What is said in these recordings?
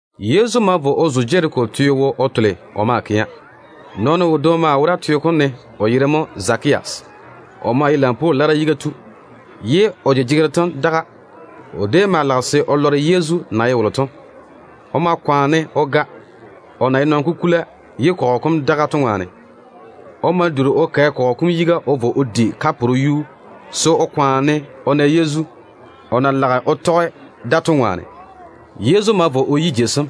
Yezu ma vo o zo Jeriko teo wo o tole o maa kɛa. Nɔɔno wodwoŋi mo wora teo kom ne, o yere mo Zakeya. O maa ye lampwoo lara yiga tu, ye o jejegero tem daga. O déem maa lage se o nii o lɔre Yezu na ye wolo to. O ma kwaane o ga, o na ye nɔn-kukula ye kɔgɔ kom daga to ŋwaane. O ma duri o kɛ kɔgɔ kom yiga o vo o di kaporo yuu se o kwaane o nii o na Yezu, o na lage o tɔge da to ŋwaane. Yezu ma vo o yi jei sem.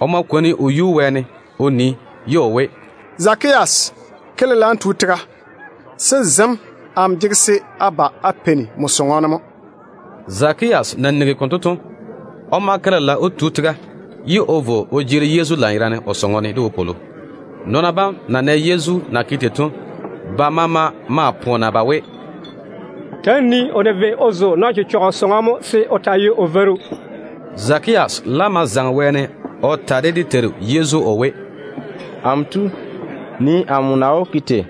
O ma kwoni o yuu wɛɛne o nii, ye o we, “Zakeya, ke lela n tu tega, se zem amo jege se a ba a peini nmo sɔŋɔ ne mo.” Zakeya na nigi konto to, o ma ke lela o tu tega, ye o vo o jeeri Yezu lanyerane o sɔŋɔ ne de wopwolo. Nɔɔna bam na nɛ Yezu na ke tei to, ba maama maa poona ba we, “Ta‑á nii-na o na vei o zo nɔn-chechɔgɔ sɔŋɔ mo se o taa ye o veiru.” Zakeya laam ma zaŋe wɛɛne o ta de dé Teiru Yezu o we, “Amo Tu, nii amo na wó ke tei.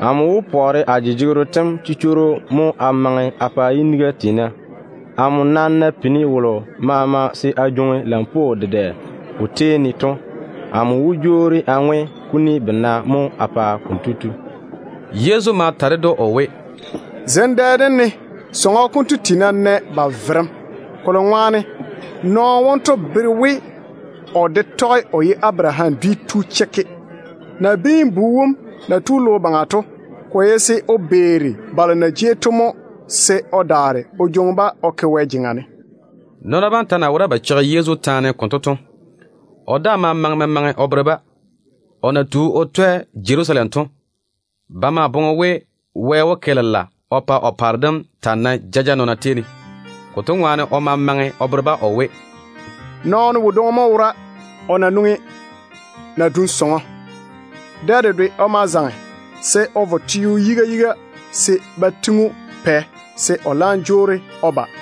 Amo wó pɔɔre a jejegero tem chichworo mo a maŋe a pa yiniga tiina. Amo nam na pini wolo maama se a jwoŋi lampwoo dedɛ o tei ne to, amo wó jwoori a ŋwe kuni bena mo a pa kotu.” Yezu ma ta ded‑o o we, “Zem dɛ dem ne sɔŋɔ konto tiina nɛ ba verem, kolo ŋwaane nɔɔno wonto bere we o de tɔge o ye Abaraham dwi tu chekke. Nabiin-bu wom na tu logo baŋa to, ko ye se o beeri balo na jei to mo, se o daare o jwoŋi-ba o ke Wɛ jeŋa ne.” Nɔɔna bam ta na wora ba cheigi Yezu taane konto to, o daa ma maŋe memaŋe o bere-ba. O na tu o twɛ Jerusalem to, ba maa boŋe we Wɛ wó ke lela o pa o paare dem taa nae jaja nɔɔna tei ne. Konto ŋwaane o ma maŋe o bere-ba o we, “Nɔɔno wodwoŋi mo wora, o na nwoŋi nadum sɔŋɔ. Dɛ dedwe o ma zaŋe se o vo sa-teo yiga yiga se ba tiŋi‑o pɛ se o laam jwoori o ba.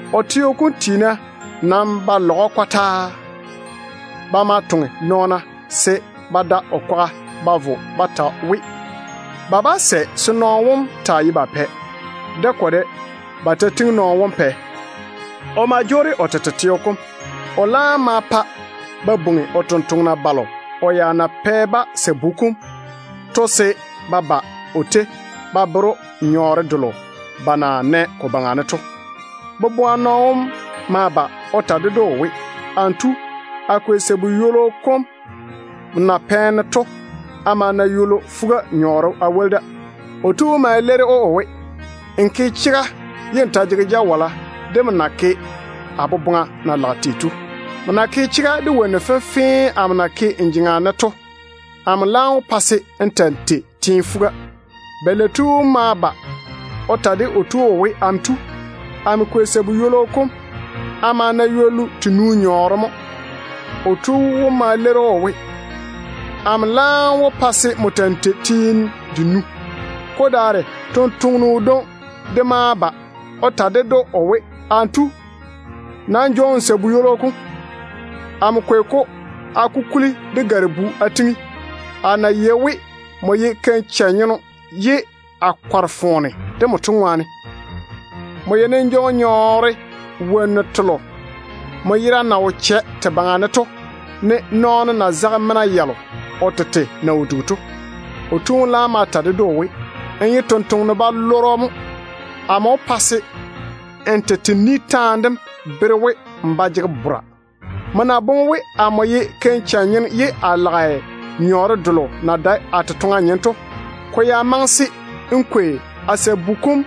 O teo kom tiina nam ba lage o ni taane kɔtaa. Ba ma toŋe nɔɔna se ba da o kwaga ba vo ba ta we, ba bá sɛ se nɔɔno wom taa ye ba pɛ. De ko de, ba ta tiŋi nɔɔno wom pɛ. O ma jwoori o tete teo kom. O laam ma pa ba bwoŋi o tontoŋena balo o ya na pɛ-ba sabu kom to se ba ba o tei ba bere‑o nyɔɔre delo ba na nɛ ko baŋa ne to. Boboa nɔɔno wom ma ba o ta ded‑o o we, ‘Amo tu, a kwei sabu ywolo nmo na pɛ-ne to a ma na ywollu fuga nyɔɔre a woli da.’ O tu wom ma leiri‑o o we, ‘Nmo ke chega ye n ta jege jawala de nmo na ke a boboŋa na lage tei to. Nmo na ke chega de wonnu fenfee amo na ke n jeŋa ne to, amo laam wó pa se n ta‑n tei teene fuga.’ Balei tu wom ma ba o ta de o tu wom o we, ‘Amo tu, amo kwei sabu ywolo kom a ma na ywollu tenu nyɔɔre mo.’ O tu wom ma leiri‑o o we, ‘Amo laam wó pa se n ta‑n tei teene denu.’ Ko daare tontoŋeno wodwoŋi de daa ma ba o ta ded‑o o we, ‘Amo tu, nam jwoori n jwoŋi nmo sabu ywolo kom. Amo kwei-ko mo a kukuli de gare-bu a tiŋi, a na yei we nmo ye keim-chɛ-nyeno ye a kɔre foone de nmo to ŋwaane. Nmo yeini n jwoŋi nyɔɔre wonnu telo nmo yera na wo chɛ te baŋa ne to, ne nɔɔno na zage mena yalo o tete na wo dugi to.’ O tu wom laam ma ta ded‑o o we, ‘Nmo ye tontoŋeno-balɔrɔ mo. Amo wó pa se n tete ni taane dem bere‑m we, n ba jege bora. Nmo na boŋe we amo ye keim-chɛ-nyeno ye a lage nyɔɔre delo na dae a totoŋa nyem to, ko ya maŋe se n kwei a sabu kom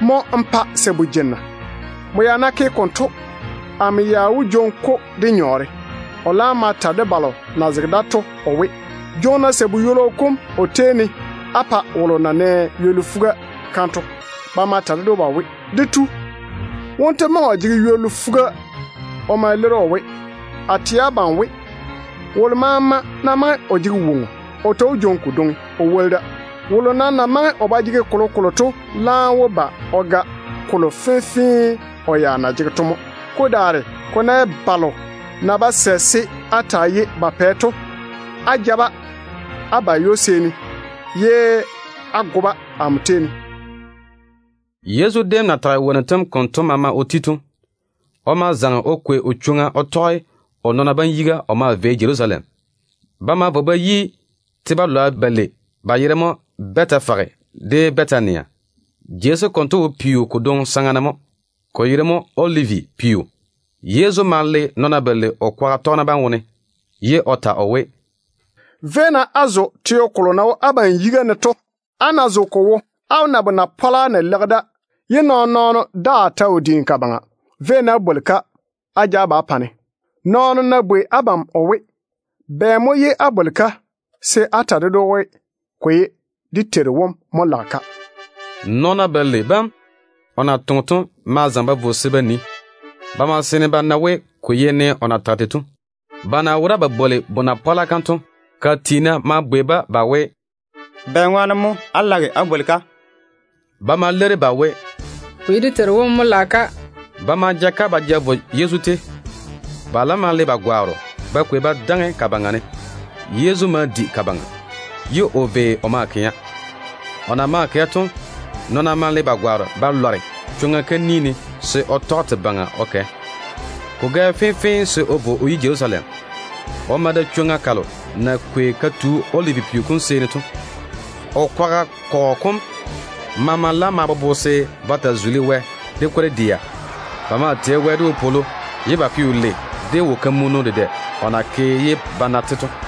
mo n pa sabu jenna. Nmo ya ná ke konto, amo ya wó jwoŋi-ko de nyɔɔre.’ O laam ma ta de balo na zege da to o we, ‘Jwoŋi-na sabu ywolo kom o tei ne á pa wolo na nɛ ywollu fuga kam to.’ Ba ma ta ded‑o ba we, ‘Dé tu, wonto maŋe o jege ywollu fuga.’ O ma leiri o we, ‘A nam tɛ abam we, wolo maama ná maŋe o jege woŋo, o ta wó jwoŋi kodwoŋi o woli da. Wolo nam na maŋe o ba jege kolokolo to laam wó ba o ga kolo fenfee o ya na jege to mo. Ko daare ko ná ye balo na ba sɛ se a taa ye ba pɛ to, ja-ba-na á ba ywo-seeni, ye á go-ba amo tei ne.’” Yezu déem na tage wonnu tem konto maama o ti to, o ma zaŋe o kwei o chwoŋa o tɔge o nɔɔna bam yiga o maa vei Jerusalem. Ba ma vo ba yi te-balwa balei, ba yere mo Bɛtefage de Bɛtania. Jei sem konto wo peo kodwoŋi saŋa ne mo, ko yere mo Olivi peo. Yezu ma le nɔɔna balei o kwaga tɔgena bam wone, ye o ta o we, “Véi-na á vo á zo teo kolo na wo abam yiga ne to. Á ná zo ko wo, á wó na bona-pɔla na leigi da ye nɔɔn-nɔɔno daa ta wo diini ka baŋa. Véi-na á bwoli-ka á ja ba á pa-ne. Nɔɔno nam ná bwei abam o we, ‘Bɛ mo ye á bwoli-ka?’ se á ta ded‑o we, ‘Ko ye dé Teiru wom mo lage-ka.’” Nɔɔna balei bam o na toŋe to ma zaŋe ba vo se ba nii. Ba ma seene ba na we, ko ye ne o na tage tei to. Ba na wora ba bwoli bona-pɔla kam to, ka tiina ma bwei-ba ba we, “Bɛŋwaane mo á jege bonaga kam á bwola?” Ba ma leiri ba we, “Ko ye dé Teiru wom mo lage-ka.” Ba ma ja-ka ba ja vo Yezu tei. Ba laam ma le ba gwaaro ba kwei ba daŋe ka baŋa ne. Yezu ma di ka baŋa, ye o vei o maa kɛa. O na maa kɛ to, nɔɔna ma le ba gwaaro ba lware chwoŋa kam ni ne se o tɔge te baŋa o kɛ. Ko gɛ fenfee se o vo o yi Jerusalem. O ma da chwoŋa kalo na kwei ka tu Olivi peo kom seeni to. O kwaga kɔgɔ kom maama laam ma bobo se ba taa tei Wɛ de kwor-dɛa. Ba maa jege wopwolo de wo-kamunnu dedɛ o na ke ye ba na-te to,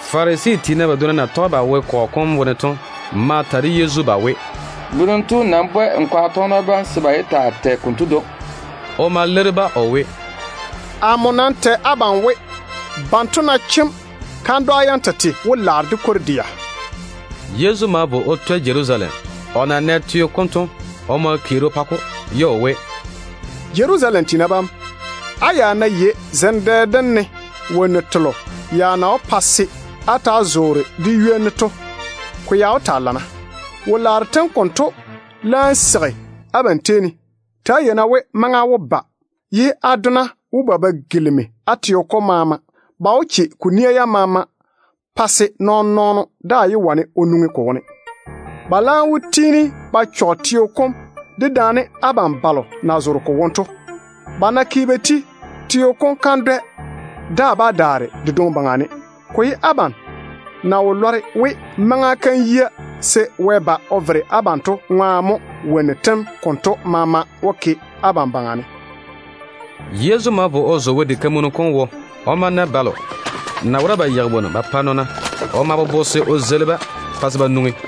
Farisi tiina badwonna na tɔge ba wo kɔgɔ kom wone to ma ta de Yezu ba we, “Berem tu, nam bwɛ n kwaga tɔgena bam se ba yé taa tɛ konto dwoŋi.” O ma leiri-ba o we, “Amo nam tɛ abam we, banto ná chem, kandwa yam tete wó laare de kwor-dɛa.” Yezu ma vo o twɛ Jerusalem. O na nɛ teo kom to, o ma keeri o pa-ko, ye o we, “Jerusalem tiina bam, á ya ná yei zem dɛ dem ne wonnu telo na wó pa se á ta‑á zoore de ywoni to, ko ya wó taa lana. Wo-laaro tem konto laam seigi abam tei ne. Ta‑á yei-na we maŋa wó ba, ye á dona wó ba ba gilimi á teo kom maama. Ba wó che ko nia yam maama pa se nɔɔn-nɔɔno daa yé wane o nwoŋi ko wone. Ba laam wó tiini ba chɔge teo kom, dedaane abam balo na zoore ko wone to. Ba ná ke ba ti, teo kom kandwɛ daa bá daare de dwoŋi baŋa ne. Ko ye abam na wo lɔre we maŋa kam yia se Wɛ ba o vere abam to ŋwaane mo wonnu tem konto maama lage te ke abam baŋa ne.” Yezu ma vo o zo Wɛ diga kam wo. O ma na balo na wora ba yeigi wonnu ba pa nɔɔna. O ma bobo se o zeili-ba pa se ba nwoŋi.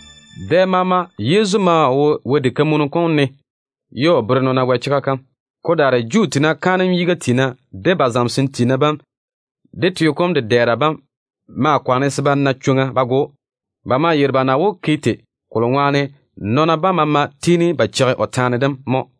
Dɛ maama Yezu maa wo Wɛ diga kam ne ye o bere nɔɔna Wɛ chega kam. Ko daare Juu tiina kaanem yiga tiina, de ba zamesem tiina bam, de teo kom dedɛɛra bam maa kwaane se ba na chwoŋa ba go‑o. Ba maa yeiri ba na wó ke tei, kolo ŋwaane nɔɔna bam maama tiini ba cheigi o taane dem mo.